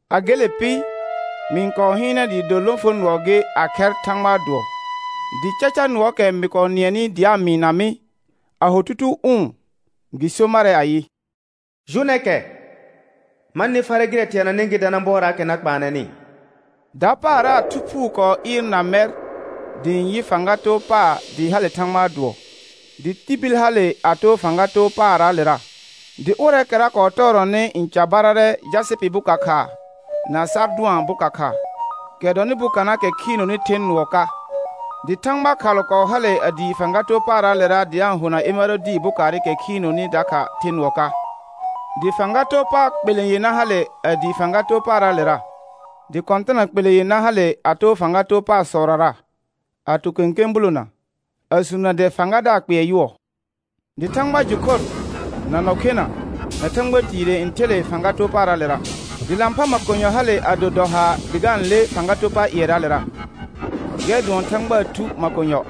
A gele pɩ, mɩ-n kɔɔ hɩɩnɛ dɩɩ do lõfonʋɔ gɩ a khɛr Thãgbaa dʋɔ, dɩ caca nʋɔɔkɛ mɩ kɔɔ nɩɛnɩ dɩ a-n mɩɩna mɩ a ho tutuu ʋʋn gɩ so marɛ ayɩ: Jʋnɛ kɛ, ma nɩ farɛ gɩrɛ teananɩ gɩ dana bɔɔraakɛ na kpaanɛnɩ. Dapaara Thu Phuu kɔɔ ɩɩrna mɛr dɩ ɩ̃ yɩ fãga too paar dɩɩ hale Thãgbaa dʋɔ, dɩ tibil hale a too fãga too paarraalera. Dɩ ʋrɛɛkɛra kɔɔ tɔɔrɔnɩ n carbararɛ jasɩpɩ boka khaa na sardʋan boka khaa, kɛ dɔnɩ bokanaakɛ khiinoni the nʋɔ ka, dɩ thãgba khalʋ kɔɔ hale a dii fãga too paarraalera dɩ a-n hona emərodi bokaarɩkɛ khiinoni dakha the nʋɔ ka. Dɩ fãga too pa kpelẽ yenã hale a dii fãga too paarraalera, dɩ kɔ̃tɩna kpelẽ yenã hale a too fãga too paarsɔrara, a to kẽkẽ bulona, a suunə dɛ fãgadaar kpɩɛr yʋɔ. Dɩ thãgba jʋ khor, na nɔ khena, na thãgba tiire n ther le fãga too paarraalera; dɩ lãphã makonyɔ hale a do dɔ haar dɩ ga-n le fãga too pa ƴɩɛraalera, gɛr dʋɔn Thãgbaa Thu makonyɔ.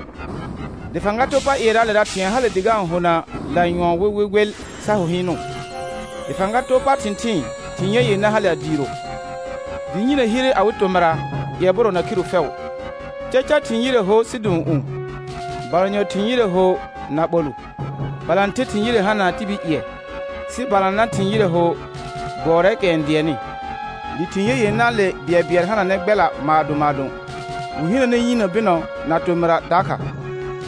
Dɩ fãga too pa ƴɩɛraalera thɩ̃ɛ hale dɩ ga-n hona lanyʋɔn wɩwɩwɩl sa ho hɩɩnʋ. Dɩ fãga too pa thɩ̃thɩɩn thɩ̃ ye yenã hale a diiro, dɩ yinə hire awɩ tomɩra ƴɛbʋrɔ na khiru fɛʋ. Caca thɩ̃ yire hor sidũ'ũu, balanyɔ thɩ̃ yire ho na ɓolʋ, balãther thɩ̃ yire hana tibil ƴɩɛ, sɩ balanã thɩ̃ yire ho gbʋɔrɛɛkɛ n dɩɛnnɩ. Dɩ thɩ̃ ye yenãale bɩɛlbɩɛl hananɛ gbɛla maadõ maadõ, wɩ hinəne yinə bɩnɔ na tomɩrra dakha,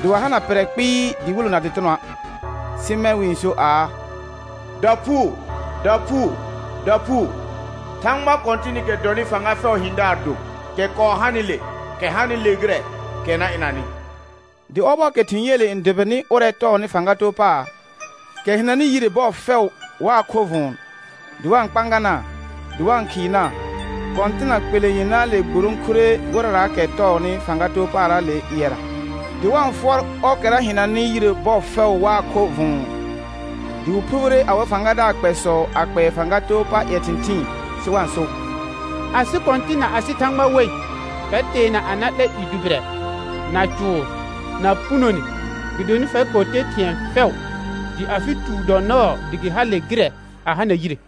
dɩ wa hana pɩrrɛ kpɩɩ dɩwɩlʋ na dɩtɩnɔa', sɩ mɛ̃ wɩ-n so aa: «Daphuu, daphuu, daphuu, Thãgba Kɔ̃tɩnɩkɛ dɔnɩ fãga fɛʋʋ hɩ̃daar do, kɛ kɔɔ hanɩle, kɛ hanɩle gɩrɛ, kɛ na ɩnanɩ.» Dɩ ɔbɔɔkɛ thɩ̃ yeele n dʋbɩnɩ ʋrɛ tɔɔnɩ fãga too paar, kɛ hɩnanɩ yire bɔɔ fɛʋ waa khorr vʋ̃ʋ, dɩ wa-n kpãganaa, dɩ wa-n khɩɩnaa, kɔ̃tɩna kpelẽ yenãale gburõkure ʋrɛraakɛ tɔɔnɩ fãga too paarraale ƴɩɛra, dɩ wa-n fʋɔr ɔrkɛra hɩnanɩ yire bɔɔ fɛʋ waa khorr vʋ̃ʋ, dɩ wɩ phubire awɩ fãgadaar kpɛsɔ a kpɛɛ fãga too pa ƴɛ thɩ̃thɩɩn sɩ wa-n so: Asɩ Kɔ̃tɩ̃ na asɩ Thãgba wei, fɛr teana a na 'lɛ i dʋbɩrɛ, na cʋʋr, na punone; gɩdonɩ fɛr kɔɔ te thɩ̃ɛ fɛʋ, dɩ afɩ tuur dɔ nɔɔ dɩ gɩ hale gɩrɛ a hana yire.